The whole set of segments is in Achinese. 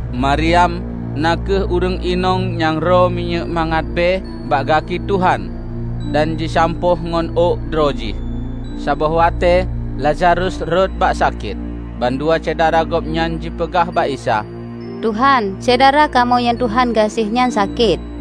Maryam na kheueh ureuëng inong nyang rô minyéuk mangat bée bak gaki Tuhan, dan jisampôh ngon ôk droe jih. Saboh watée Lazarus rhot bak sakét. Bandua syedara Gobnyan jipeugah bak Isa, "Tuhan, syedara kamoe nyang Tuhan gaséh nyan sakét."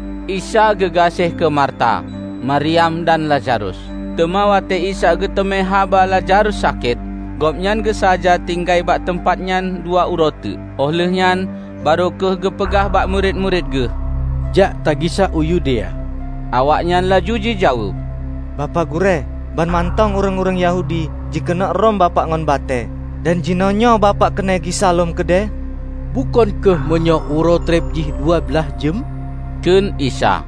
Isa geugaséh keu Marta, Maryam dan Lazarus. Teuma watée Isa geuteumé haba Lazarus sakét, Gobnyan geusaja tinggai bak teumpat nyan dua uroe teuk. Óh lheueh nyan barô kheueh geupeugah bak murit-murit Geuh, "Jak tagisa u Yudea." Awaknyan laju jijaweueb, "Bapak Gurée, banmantong ureuëng-ureuëng Yahudi jikeuneuk rhom Bapak ngon batée dan jinoenyoe Bapak keuneuk gisa lom keudeh?" "Bukon kheueh meunyoe uroe treb jih dua blaih jeuem?" kheun Isa.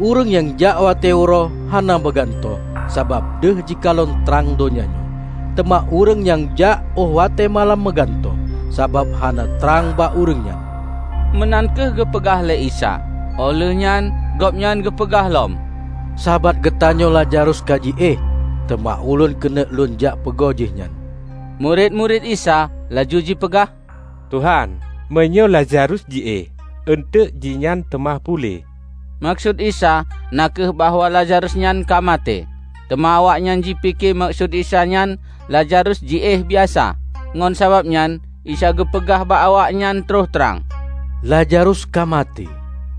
"Ureuëng nyang jak watée uroe, hana meugantôh sabab deuh jikalon trang donya nyoe. Teuma ureuëng nyang jak óh watée malam meugantôh, sabab hana trang bak ureuëng nyan." Meunan kheueh geupeugah lé Isa. Óh lheuehnyan gobnyan geupeugah lom, "Sahabat geutanyoe Lazarus ka jiéh, teuma Ulôn keuneuk Lôn jak peugo jihnyan." Murit-murit Isa laju jipeugah, "Tuhan, meunyoe Lazarus jiéh, eunteuk jihnyan teuma puléh." Meukeusut Isa na kheueh bahwa Lazarus nyan ka maté. Teuma awaknyan jipike meukeusut Isa nyan Lazarus jiéh biasa. Ngon sababnyan Isa geupeugah bak awaknyan troh trang, "Lazarus ka maté.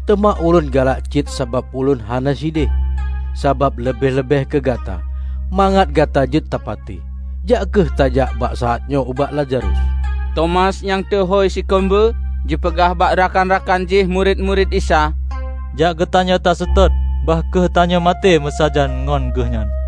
Teuma Ulôn galak cit sabab Ulôn hana sideh, sabab leubeh-leubeh keu gata, mangat gata jeuet tapatéh. Jak kheueh tajak bak saát nyoe ubak Lazarus." Tomas nyang teuhôi "Sikeumbeue" jipeugah bak rakan-rakan jih murit-murit Isa, "Jak geutanyoe taseutôt, bah kheueh tanyoe maté meusajan ngon Geuhnyan!"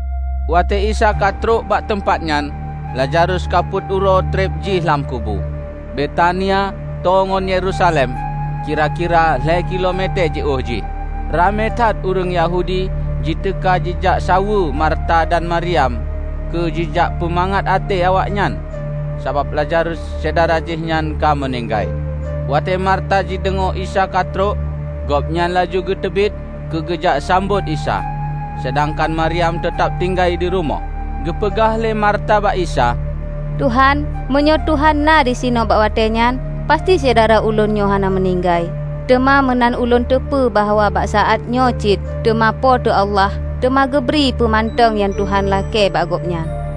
Watée Isa ka trok bak teumpat nyan, Lazarus ka peuet uroe treb jih lam kubu. Betania tô ngon Yerusalem, kira-kira lhée kilo metée jiôh jih. Ramé that ureuëng Yahudi jiteuka jijak saweue Marta dan Maryam keu jijak peumangat até awaknyan sabab Lazarus syedara jihnyan ka meuninggai. Watée Marta jideungoe Isa ka trok, gobnyan laju geuteubiet keu geujak sambot Isa. Seudangkan Maryam teutab tinggai di rumoh. Geupeugah lé Marta bak Isa, "Tuhan, meunyoe Tuhan na disinoe bak watée nyan, pasti syedara ulôn nyoe hana meuninggai. Teuma meunan ulôn teupeu bahwa bak saátnyoe cit teuma Po teu Allah teuma geubri peue mantong nyang Tuhan lakée bak gobnyan."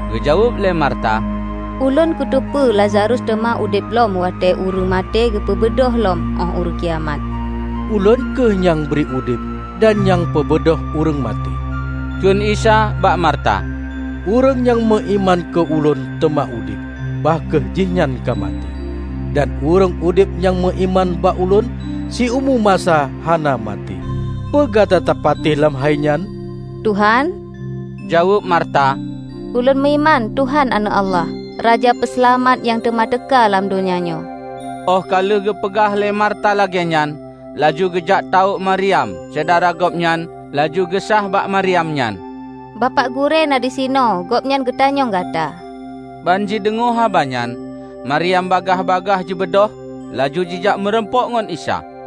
Geujaweueb lé Marta, "Ulôn kuteupeue Lazarus teuma udeb lom watée ureuëng maté teupeubeudôh lom óh Uroe Kiamat." "Ulôn kheueh nyang bri udeb dan nyang peubeudôh ureuëng maté," kheun Isa bak Marta. "Ureuëng nyang meuiman keu Ulôn teuma udeb, bah kheueh jihnyan ka maté. Dan ureuëng udeb nyang meuiman bak Ulôn, siumu masa hana maté. Peue gata tapatéh lam hainyan?" "Tuhan" jaweueb Marta, "Ulôn meuiman Tuhan Aneuëk Allah, Raja Peuseulamat nyang teuma teuka lam donya nyoe." Óh ka lheueh geupeugah lé Marta lagée nyan, laju geujak tawök Maryam, syedara gobnyan laju geusáh bak Maryam nyan, "Bapak Gurée na disinoe; Gobnyan geutanyong gata." Ban jideungoe haba nyan, Maryam bagaih-bagaih jibeudôh, laju jijak meurumpok ngon Isa.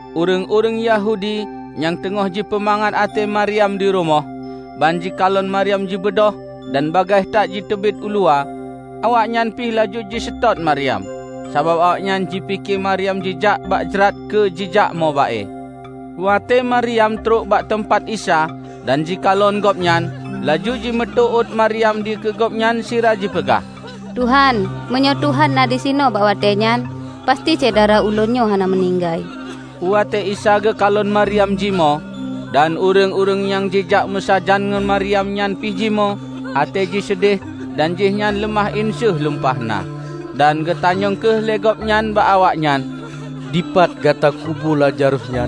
Ureuëng-ureuëng Yahudi nyang teungoh jipeumangat até Maryam di rumoh, ban jikalon Maryam jibeudôh dan bagaih that jiteubiet uluwa; awaknyan pi laju jiseutôt Maryam, sabab awaknyan jipike Maryam jijak bak jrat keu jijak mo ba-e. Watée Maryam trok bak teumpat Isa dan jikalon Gobnyan, laju jimeuteuôt Maryam dikeue Gobnyan sira jipeugah, "Tuhan, meunyoe Tuhan na disinoe bak watée nyan, pasti syedara ulôn nyan hana meuninggai." Watée Isa geukalon Maryam jimoe, dan ureuëng-ureuëng nyang jijak meusajan ngon Maryam nyan pi jimoe, até ji seudeh, dan jihnyan leumah inseuh lumpah na. Dan geutanyong kheueh lé gobnyan bak awaknyan, "Dipat gata kubu Lazarus nyan?"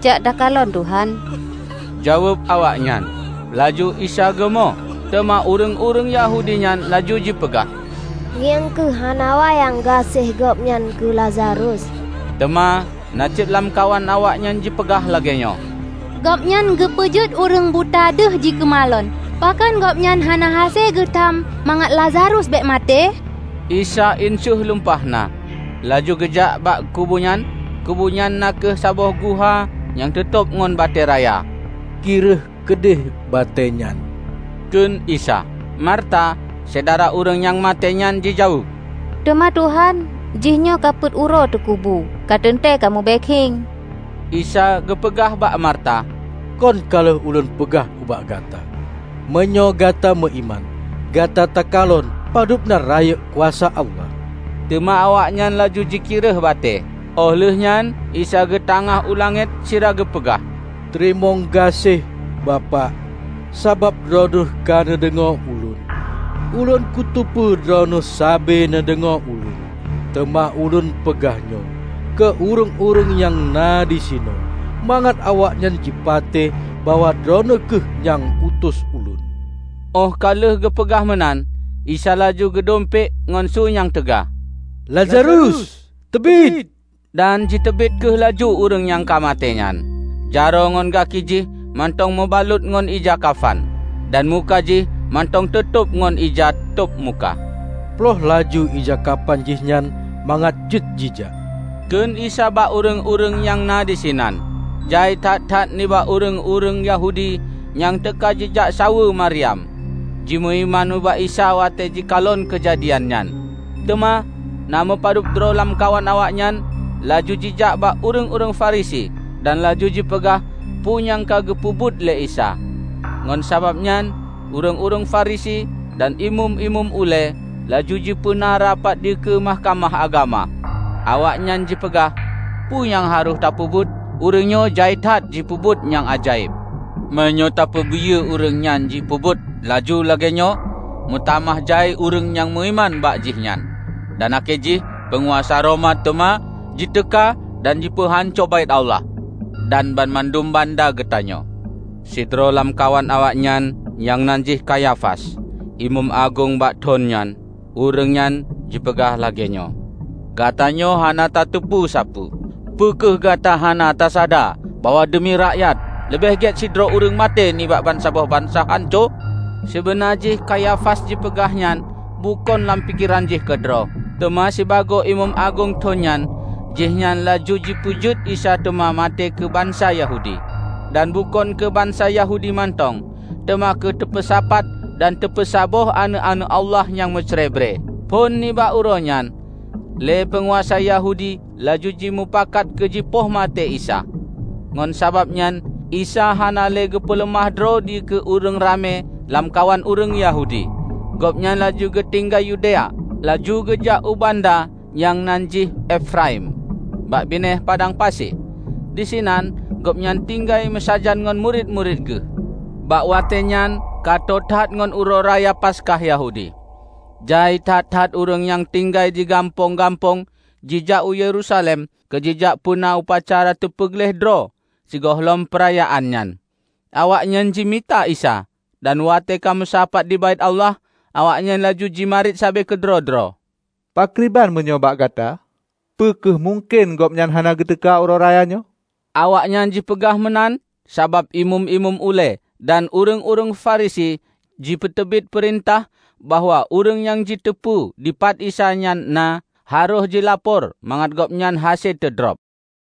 "Jak takalon, Tuhan," jaweueb awaknyan. Laju Isa geumo. Teuma ureuëng-ureuëng Yahudi nyan laju jipeugah, "Ngieng kheueh, hana wayang gaséh Gobnyan keu Lazarus!" Teuma na cit lamkawan awaknyan jipeugah lagée nyoe, "Gobnyan geupeujeuet ureuëng buta deuh jikeumalon, pakon Gobnyan hana hase geutam mangat Lazarus bék maté?" Isa inseuh lumpah na, laju geujak bak kubunyan. Kubu nyan na kheueh saboh guha nyang teutôb ngon batée raya. "Kireueh keudeh batée nyan," kheun Isa. Marta, syedara ureuëng nyang maté nyan jijaweueb, "Teuma, Tuhan, jihnyoe ka peuet uroe teukubu. Kateuntée ka mubée khiéng!" Isa geupeugah bak Marta, "Kon ka lheueh Ulôn peugah bak gata: meunyoe gata meuiman, gata takalon padubna rayeuk kuasa Allah!" Teuma awaknyan laju jikireueh batée. Óh lheuehnyan Isa geutangáh u langét sira geupeugah, "Teurimong gaséh, Bapak, sabab Droeneueh ka neudeungoe Ulôn. Ulôn kuteupeu Droeneueh sabe neudeungoe Ulôn, teuma Ulôn peugah nyoe, keu ureuëng-ureuëng nyang na disinoe; mangat awaknyan jipatéh bahwa Droeneueh kheueh nyang utus Ulôn." Óh ka lheueh geupeugah meunan, Isa laju geudumpék ngon su nyang teuga, "Lazarus, teubiet!" Dan jiteubiet kheueh laju ureuëng nyang ka maté nyan. Jaroe ngon gaki jih mantong meubalot ngon ija kafan, dan muka jih mantong teutôb ngon ija tôb muka. "Ploh laju ija kafan jihnyan mangat jeuet jijak," kheun Isa bak ureuëng-ureuëng nyang na disinan. Jai that-that nibak ureuëng-ureuëng Yahudi nyang teuka jijak saweue Maryam, jimeuiman ubak Isa watée jikalon keujadian nyan. Teuma na meupadub droe lamkawan awaknyan laju jijak bak ureuëng-ureuëng Farisi dan laju jipeugah peue nyang ka geupeubuet lé Isa. Ngon sabab nyan ureuëng-ureuëng Farisi dan imeum-imeum ulée laju jipeuna rapat dikeue Mahkamah Agama. Awaknyan jipeugah, "Peue nyang harôh tapeubuet? Ureuëng nyoe jai that jipeubuet nyang ajaéb! Meunyoe tapeubiyeu ureuëng nyan jipeubuet laju lagée nyoe meutamah jai ureuëng nyang meuiman bak jih nyan. Dan akhé jih peunguasa Roma teuma jiteuka dan jipeuhanco Baét Allah dan banmandum banda geutanyoe!" Sidroe lamkawan awaknyan nyang nan jih Kayafas, imeum agong bak thon nyan, ureuëng nyan jipeugah lagée nyoe, "Gatanyoe hana tateupeue sapeue. Peu kheueh gata hana tasada bahwa deumi rakyat, leubeh gét sidroe ureuëng maté nibak bansaboh bansa hanco?" Sibeuna jih Kayafas jipeugah nyan, bukon lam pikeran jih keudroe. Teuma sibagoe imeum agong thon nyan jihnyan laju jipeujeuet Isa teuma maté keu bansa Yahudi. Dan bukon keu bansa Yahudi mantong, teuma keu teupeusapat dan teupeusaboh aneuëk-aneuëk Allah nyang meucrebre. Phon nibak uroenyan lé peunguasa Yahudi laju jimeupakat keu jipoh maté Isa. Ngon sabab nyan Isa hana le geupeuleumah droe dikeue ureuëng ramé lamkawan ureuëng Yahudi. Gobnyan laju geutinggai Yudea, laju geujak u banda nyang nan jih Efraim bak binéh padang pasi. Disinan Gobnyan tinggai meusajan ngon murit-murit Geuh. Bak watée nyan ka tô that ngon Uroe Raya Paskah Yahudi. Jai that-that ureuëng nyang tinggai di gampông-gampông jijak u Yerusalem keu jijak peuna upacara teupeugleh droe sigohlom peurayaan nyan. Awaknyan jimita Isa, dan watée ka meusapat di Baét Allah, awaknyan laju jimarit sabe keudroe-droe, "Pakriban meunyoe bak gata? Peu kheueh mungken Gobnyan hana geuteuka uroe raya nyoe." Awaknyan jipeugah meunan sabab imeum-imeum ulée dan ureuëng-ureuëng Farisi jipeuteubiet peurintah bahwa ureuëng nyang jiteupeue dipat Isa nyan na, harôh jilapor mangat Gobnyan hase teudrob.